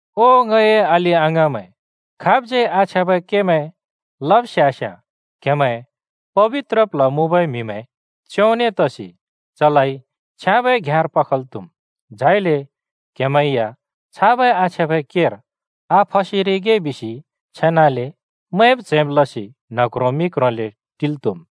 ओ ङए अलि-अङाँमैं, खाबज्यै आछ्याँबै केमैं लब स्यास्याँ क्हेमैं पबित्र प्ल्ह मुँबै म्हिमैं च्योंने तसि चलाइ छ्याँबै घ्याँर पखल् त्हुम्। झाइले क्‍हेमैं या छाबै आछ्याँबै केर आफसेरिगे बिसि छेनाले मैंब च्हैंब लसि न्ह क्रों मि क्रोंले टिल् त्‍हुम्।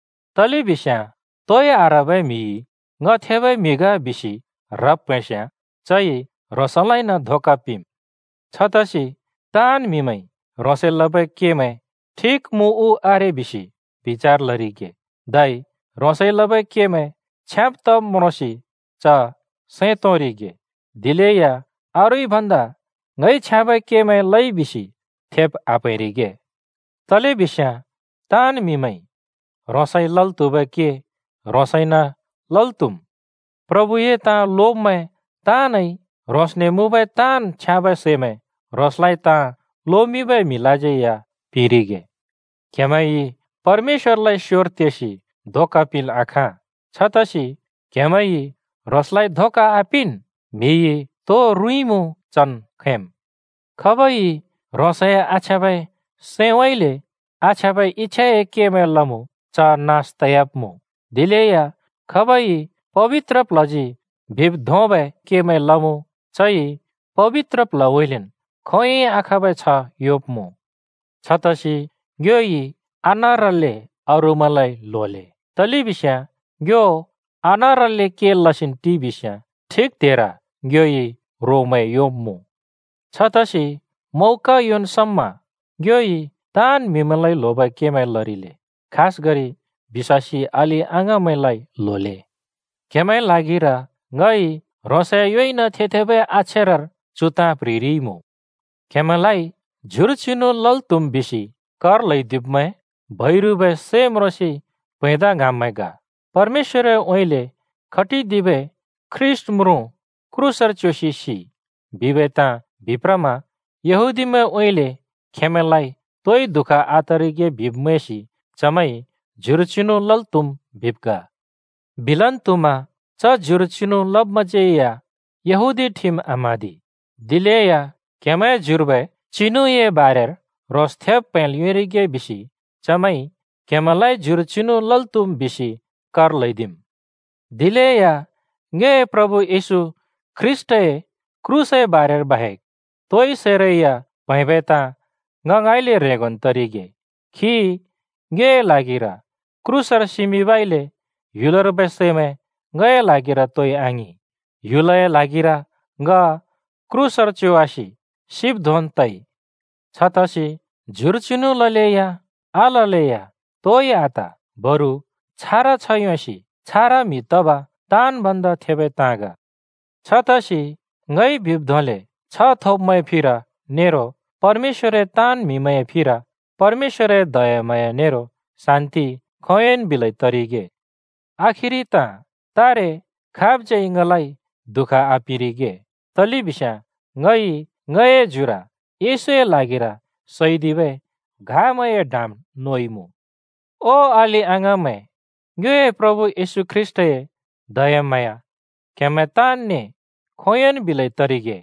तलेबिस्याँ तोइ आह्रबै म्हिइ “ङ थेबै म्हि ग” बिसि ह्रब् प्हैंस्याँ चइ ह्रोंसलाइन धोका पिंम्। छतसि ताँन् म्‍हिमैंइ ह्रोंसइ लबै केमैं ठिक मुँ उ आरे बिसि बिचार लरिगे, धै ह्रोंसइ लबै केमैं छ्याँब तब् म्रोंसि च सैं तोंरिगे। दिलेया अरूइ भन्दा ङइ छ्याँबै केमैं लइ बिसि थेब् आप्हैंरिगे। तलेबिस्याँ ताँन् म्‍हिमैंइ ह्रोंसइ लल् त्‍हुबै के ह्रोंसइन लल् त्‍हुम्। प्रभुए ताँ लोब्मैं ताँनइ ह्रोंसने मुँबै ताँन् छ्याँबै सैमैं ह्रोंसलाइ ताँ लोमिंबै म्हिलाज्यै या पिंरिगे। क्हेमैंइ परमेश्‍वरलाइ स्‍योर तेसि धोका पिंल् आखाँ! छतसि क्हेमैंइ ह्रोंसलाइ धोका आपिंन्! म्‍हिइ तो रुँइँमुँ चन् खैंम्। खाबइ ह्रोंसए आछ्याँबै सैंउँइँले आछ्याँबै इच्‍छाए केमै लमुँ, च नास तयाब्‍मुँ, दिलेया खाबइ पबित्र प्ल्हजी बिब् धोंबै केमैं लमुँ, चइ पबित्र प्ल्हउँइँलेन् खोंयोंइ आखाँबै छ्ह योंब्‍मुँ। छतसि ङ्योइ आनारल्‍ले अरूमैंलाइ ल्होले, तलेबिस्याँ ङ्यो आनारल्‍ले के लसिन् टिइबिस्‍याँ ठिक त्हेर ङ्योइ रोमैं योंब्‍मुँ। छतसि मौका योंन् समा ङ्योइ ताँन् म्हिमैंलाइ ल्होबै केमैं लरिले, खासगरि बिश्‍वासी अलि-अङाँमैंलाइ ल्होले। क्हेमैंए ल्हागिर ङइ ह्रोंसए योइन थे-थेबै अक्षरर चु ताँ प्‍ह्रिरिइमुँ। क्हेमैंलाइ ज्युर चिनु लल् त्‍हुम् बिसि कर ल्‍हैदिब्मैं बैरुबै सै म्रोंसि प्हैंदा ङ्हाँब्मैं ग। “परमेश्‍वरउँइँले खटिदिबै ख्रीष्‍ट म्रुँ क्रूसर च्योसि सिइ,” बिबै ताँ बिप्रमा यहूदीमैंउँइँले खेंमैंलाइ तोइ दुःख आतरिगे बिब् मैंसि चमैंइ “ज्युर चिनु लल् त्‍हुम्” बिब् ग। बिलन् त्हुमा च ज्युर चिनु लब्‍मैंज्‍यै या यहूदी ठिम आम्हाँदि। दिलेया क्‍हेमैंए ज्युर्बै चिनुए बारेर ह्रोंस थेब् प्‍हैंल् योंरिगे बिसि चमैंइ क्‍हेमैंलाइ ज्युर चिनु लल् त्‍हुम् बिसि कर ल्‍हैदिम्। दिलेया ङ्योए प्रभु येशू ख्रीष्‍टए क्रूसए बारेर बाहेक तोइ सैरै या प्हैंबै ताँ ङ ङाँइँले ह्रेंगोन् तरिगे। खी ङ्योए ल्हागिर क्रूसर सिमिंबइले ह्‍युलर्बै सैमैं ङए ल्हागिर तोइ आङिं, ह्‍युलए ल्हागिर ङ क्रूसर च्योवासि सिब् धोंन् तइ। छतसि ज्युर चिनु ललेया आललेया तोइ आत, बरु छारा छ्ह योंसि छारा म्‍हि तब ताँन् भन्दा थेबै ताँ ग। छतसि ङइ बिब् धोंले छ्ह थोब्मैंए फिर नेरो परमेश्‍वरए ताँन् म्‍हिमैंए फिर परमेश्‍वरए दयाम्हाँया नेरो शान्ति खोंयोंन् बिलै तरिगे। आखिरि ताँ: तारे खाबज्यै ङलाइ दुःख आपिंरिगे, तलेबिस्याँ ङइ ङए ज्युर येशूए ल्हागिर सैदिबै घामैंए डाम नोइमुँ। ओ अलि-अङाँमैं, ङ्योए प्रभु येशू ख्रीष्‍टए दयाम्हाँया क्‍हेमैं तानने खोंयोंन् बिलै तरिगे।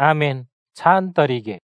आमेन, छान तरिगे।